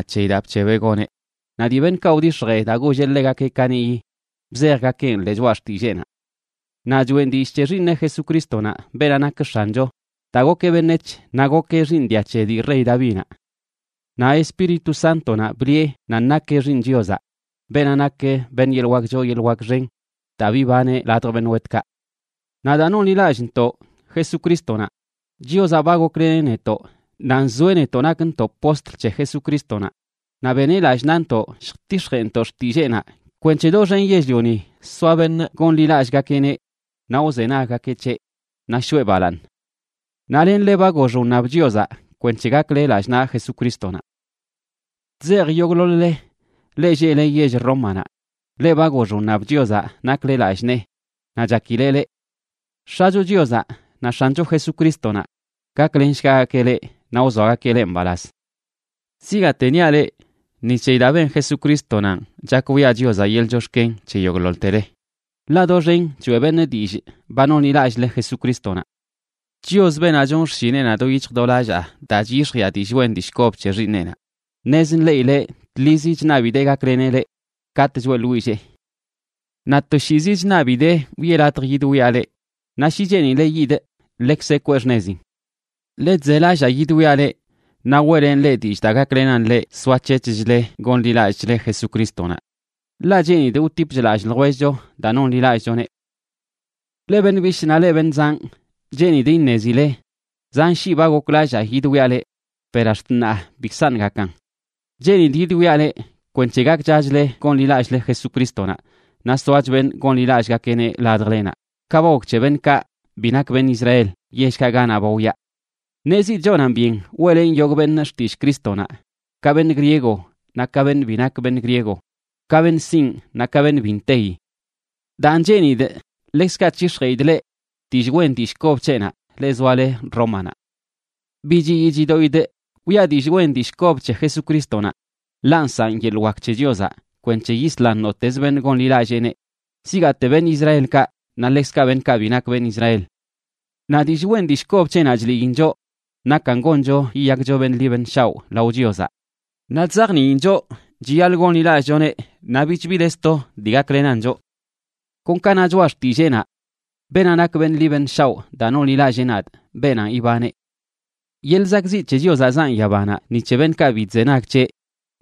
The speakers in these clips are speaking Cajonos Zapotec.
c̱heyi daa bc̱hebeꞌ goneꞌ, naꞌ dii beṉꞌkaꞌ wdix̱jee daa golleꞌ ḻegakeꞌ kaniꞌyi bzejgakeꞌn ḻee Choꞌa Xtilleenaꞌ. Naꞌ choꞌen dillꞌ c̱he Xiiṉeꞌ Jesucrístonaꞌ, beenaꞌ nak X̱ancho, daa gokeꞌ beṉec̱h, naꞌ gokeꞌ xiiṉ dia c̱he dii rey Davinaꞌ. Naꞌ Espíritu Sántonaꞌ bliꞌe nan nakeꞌ Xiiṉ Chiozaꞌ, beenaꞌ nak beṉꞌ yeḻꞌ wak choo yeḻꞌ wak xen daa bibaneꞌ ladj beṉꞌ wetkaꞌ. Naꞌ daa nonḻilallꞌntoꞌ Jesucrístonaꞌ, Chiozaꞌ ba gokleneꞌ netoꞌ, naꞌ nzoeꞌ netoꞌ nakntoꞌ postl c̱he Jesucrístonaꞌ, naꞌ beneꞌ lallꞌ naꞌntoꞌ lljtix̱jeꞌntoꞌ xtilleenaꞌ kwenc̱he doxen yell-lioni soa beṉꞌ gonḻilallꞌgakeꞌneꞌ naꞌ wzenaggakeꞌ c̱heꞌ, naꞌ shoꞌe balaaṉ. Naꞌ lenle ba gox wṉab Chiozaꞌ kwenc̱he gakle lallꞌ naꞌ Jesucrístonaꞌ. Chzejꞌ yogꞌḻoḻ-le, leꞌ lleꞌle yell Rómanaꞌ, leꞌ ba gox wṉab Chiozaꞌ nakle lallꞌ nee naꞌ chakileꞌ leꞌ. X̱acho Chiozaꞌ naꞌ X̱ancho Jesucrístonaꞌ gaklenshgagakeꞌ leꞌ naꞌ wzoagakeꞌ leꞌ mbalaz. Zigaate niaꞌ leꞌ, ni c̱heyi daa ben Jesucrístonanꞌ chak wiꞌa Chiozaꞌ yeḻꞌ chox̱ken c̱he yogꞌḻoḻtele, ḻaꞌ doxen choeꞌ beṉꞌ dillꞌ ba nonḻilallꞌle Jesucrístonaꞌ. Chios, beenaꞌ chonꞌ xshineꞌnaꞌ do yic̱hj do lallaa daa chyix̱jiꞌa dillꞌ wen dillꞌ kob c̱he Xiiṉeꞌnaꞌ, ṉez nḻeꞌileꞌ tḻizi chṉabidee gakleneꞌ leꞌ katꞌ choeꞌḻwillee. Naꞌ toshiizi chṉabidee wiꞌe latj yidwiaꞌ leꞌ, naꞌ shi cheenileꞌ yidꞌ, ḻekzeꞌ kwee xṉezin. Ḻe chzelallaa yidwiaꞌ leꞌ naꞌ weꞌlenꞌ leꞌ dillꞌ daa gaklenan leꞌ soac̱hec̱hchle gonḻilallꞌchle Jesucrístonaꞌ. Ḻaꞌ cheenidꞌ wtipch lallꞌ ljwellcho daa nonḻilallꞌchoneꞌ. Leꞌ beṉꞌ bishꞌ naꞌ leꞌ beṉꞌ zanꞌ, cheenidꞌ iṉezile zan shii ba goklallaa yidwiaꞌ leꞌ per ax̱t ṉaa bikzaṉꞌ gakan. Cheenidꞌ yidwiaꞌ leꞌ kwenc̱he gakchachle gonḻilallꞌle Jesucrístonaꞌ naꞌ soach beṉꞌ gonḻilallꞌgakeꞌneꞌ ladjlenaꞌ, ka ba gok c̱he beṉꞌkaꞌ bi nak beṉꞌ Israel yellkaꞌ ganaꞌ ba wyaa. Ṉezidꞌ chonan byen weꞌlenꞌ yogꞌ beṉꞌ xtillꞌ Crístonaꞌ, ka beṉꞌ griego naꞌ ka beṉꞌ bi nak beṉꞌ griego, ka beṉꞌ sinꞌ naꞌ ka beṉꞌ bi nteyi. Daan, cheenidꞌ ḻekzkaꞌ c̱hix̱jeꞌidꞌ leꞌ dillꞌ wen dillꞌ kob c̱heꞌnaꞌ, leꞌ zoale Rómanaꞌ. Bi chiyii chidoꞌidꞌ wiꞌa dillꞌ wen dillꞌ kob c̱he Jesucrístonaꞌ, ḻaꞌ nsaꞌn yeḻꞌ wak c̱he Chiozaꞌ kwenc̱he yislan nottez beṉꞌ gonḻilalleeneꞌ, zigaate beṉꞌ Israelkaꞌ, naꞌ ḻekzkaꞌ beṉꞌkaꞌ bi nak beṉꞌ Israel. Naꞌ dillꞌ wen dillꞌ kob c̱heꞌnaꞌ chliin choꞌ nakan goncho yiyakcho beṉꞌ ḻi beṉꞌ shaoꞌ lao Chiozaꞌ. Naꞌ chzajniin choꞌ chiyaḻꞌ gonḻilallꞌchoneꞌ naꞌ bich bi de sto dii gaklenan choꞌ. Kon ka na Choꞌa Xtilleenaꞌ: “Beenaꞌ nak beṉꞌ ḻi beṉꞌ shaoꞌ daa nonḻilallee nadꞌ, beenanꞌ ibaneꞌ.” Yeḻꞌ zakꞌzi c̱he Chiozaꞌ zaꞌn yabanaꞌ ni c̱he beṉꞌkaꞌ bi chzenag c̱heꞌ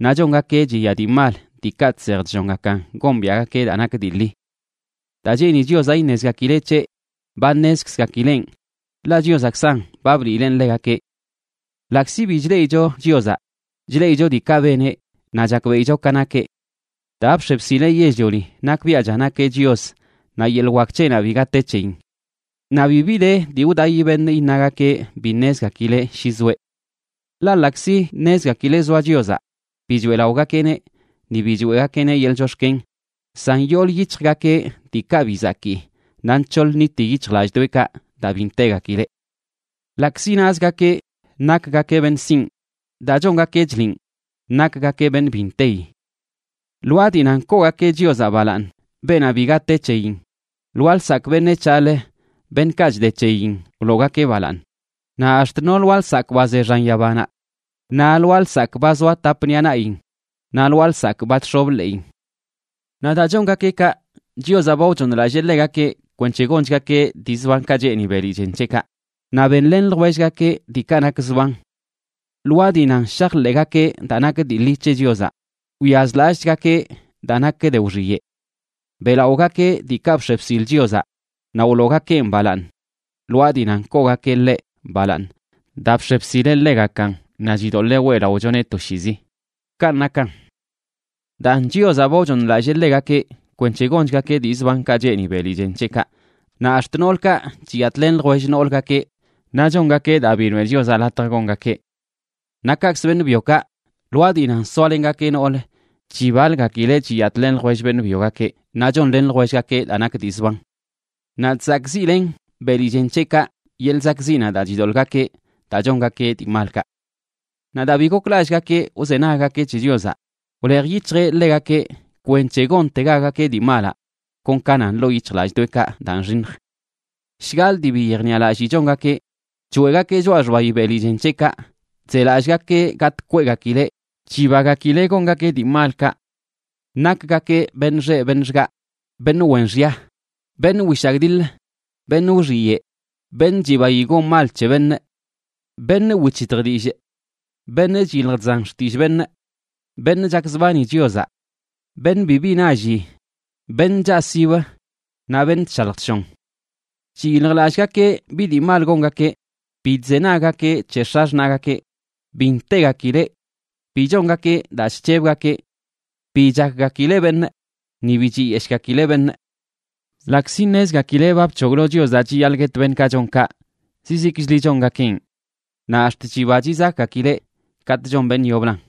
naꞌ chongakeꞌ chiya dii mal, diikaꞌ chsej chllongakan gombiaꞌgakeꞌ daa nak dii ḻi. Daa cheeni Chiozaꞌ iṉezgakileꞌ c̱heꞌ, ba ṉezkzgakileꞌn, ḻaꞌ Chiozaꞌkzan ba bliileꞌn ḻegakeꞌ. Ḻaꞌkzi bi chleꞌicho Chiozaꞌ, chleꞌicho diikaꞌ beneꞌ naꞌ chakbeꞌicho ka nakeꞌ. Daa bx̱e bsileꞌ yell-lioni nakbiaꞌcha nakeꞌ Chios naꞌ yeḻꞌ wak c̱heꞌnaꞌ biga te c̱heyin. Naꞌ bibi de dii wdaꞌi beṉꞌ iṉagakeꞌ bi ṉezgakileꞌ shi zoeꞌ. Ḻaꞌ ḻaꞌkzi ṉezgakileꞌ zoa Chiozaꞌ, bi choeꞌlaꞌogakeꞌneꞌ ni bi choeꞌgakeꞌneꞌ yeḻꞌ chox̱ken. San yoolə yic̱hjgakeꞌ diikaꞌ bi zakii naꞌ nc̱hoḻ nniti yic̱hjlallꞌdoꞌekaꞌ daa bi ntegakileꞌ. Ḻaꞌkzi nazgakeꞌ nakgakeꞌ beṉꞌ sinꞌ, daa chongakeꞌ chliꞌn nakgakeꞌ beṉꞌ bi nteyi. Lwaa dii nan koogakeꞌ Chiozaꞌ balaaṉ, beenaꞌ biga te c̱heyin, lwaa lsakꞌ beṉec̱haꞌlə, beṉꞌkaꞌ chde c̱heyin, wloogakeꞌ balaaṉ, naꞌ ax̱t no lwaa lsakꞌ ba ze xan yabanaꞌ, naꞌ lwaa lsakꞌ ba zoa tap ṉiꞌa naꞌyin, naꞌ lwaa lsakꞌ ba chx̱ob ḻeꞌin. Naꞌ daa chongakeꞌ kaꞌ, Chiozaꞌ ba wchooṉlallee ḻegakeꞌ kwenc̱he gonchgakeꞌ dii zbankaꞌ cheeni beli chen c̱heꞌkaꞌ, naꞌ benlen ljwellgakeꞌ diikaꞌ nak zban. Lwaa dii nan shajḻeꞌgakeꞌ daa nak dii ḻi c̱he Chiozaꞌ, wyazlallꞌchgakeꞌ daa nak de wxiyeꞌ. Beꞌlaꞌogakeꞌ diikaꞌ bx̱e bsil Chiozaꞌ naꞌ wloogakeꞌn balaaṉ lwaa dii nan koogakeꞌ ḻeꞌ balaaṉ daa bx̱e bsileꞌ ḻegakan naꞌ chidoḻee weꞌlaꞌochoneꞌ toshiizi. Kanꞌ nakan. Daan, Chiozaꞌ ba wchooṉlallee ḻegakeꞌ kwenc̱he gonchgakeꞌ dii zbankaꞌ cheeni beli chen c̱heꞌkaꞌ, naꞌ ax̱t noolkaꞌ chiyatꞌlen ljwell noolgakeꞌ naꞌ chongakeꞌ daa bi noeꞌ Chiozaꞌ latj gongakeꞌ. Naꞌ kaꞌkzə beṉꞌ byokaꞌ, lwaa dii nan soalengakeꞌ noolə, chibalgakileꞌ chiyatꞌlen ljwell beṉꞌ byogakeꞌ, naꞌ chonlen ljwellgakeꞌ daa nak dii zban. Naꞌ chzakꞌziꞌlen beli chen c̱heꞌkaꞌ yeḻꞌ zakꞌziꞌnaꞌ daa chidoḻꞌgakeꞌ daa chongakeꞌ dii malkaꞌ. Naꞌ daa bi goklallꞌgakeꞌ wzenaggakeꞌ c̱he Chiozaꞌ, wlej yic̱hjeꞌ ḻegakeꞌ kwenc̱he gontegagakeꞌ dii malaꞌ kon ka nan ḻoo yic̱hjlallꞌdoꞌekaꞌ daa nxiṉj. Shgaḻꞌ dii bi yejniꞌalallii chongakeꞌ, choeꞌgakeꞌ choꞌa xbayi beli chen c̱heꞌkaꞌ, chzelallꞌgakeꞌ gatꞌ kweꞌgakileꞌ, chibagakileꞌ gongakeꞌ dii malkaꞌ. Nakgakeꞌ beṉꞌ xeꞌ beṉꞌ xgaꞌ, beṉꞌ wen xya, beṉꞌ wishagdiḻə, beṉꞌ wxiyeꞌ, beṉꞌ chibayi gon mal c̱he beṉꞌ, beṉꞌ wic̱hitj dillꞌ, beṉꞌ chyilj chzan xtillꞌ beṉꞌ, beṉꞌ chakzbani Chiozaꞌ, beṉꞌ bibi nalli, beṉꞌ chaꞌsibə naꞌ beṉꞌ chshalj chshon. Chiyiljlallꞌgakeꞌ bi dii mal gongakeꞌ, bi chzenaggakeꞌ c̱he x̱axṉaꞌgakeꞌ, bi ntegakileꞌ, bi chongakeꞌ daa chc̱hebgakeꞌ, bi chakgakileꞌ beṉꞌ, ni bi chiyeshꞌgakileꞌ beṉꞌ. Ḻaꞌkzi ṉezgakileꞌ ba bc̱hoglo Chiozaꞌ chiyaḻꞌ guet beṉꞌkaꞌ chon kaꞌ, zizikchli chongakeꞌn, naꞌ ax̱t chiba chizakꞌgakileꞌ katꞌ chon beṉꞌ yoblan.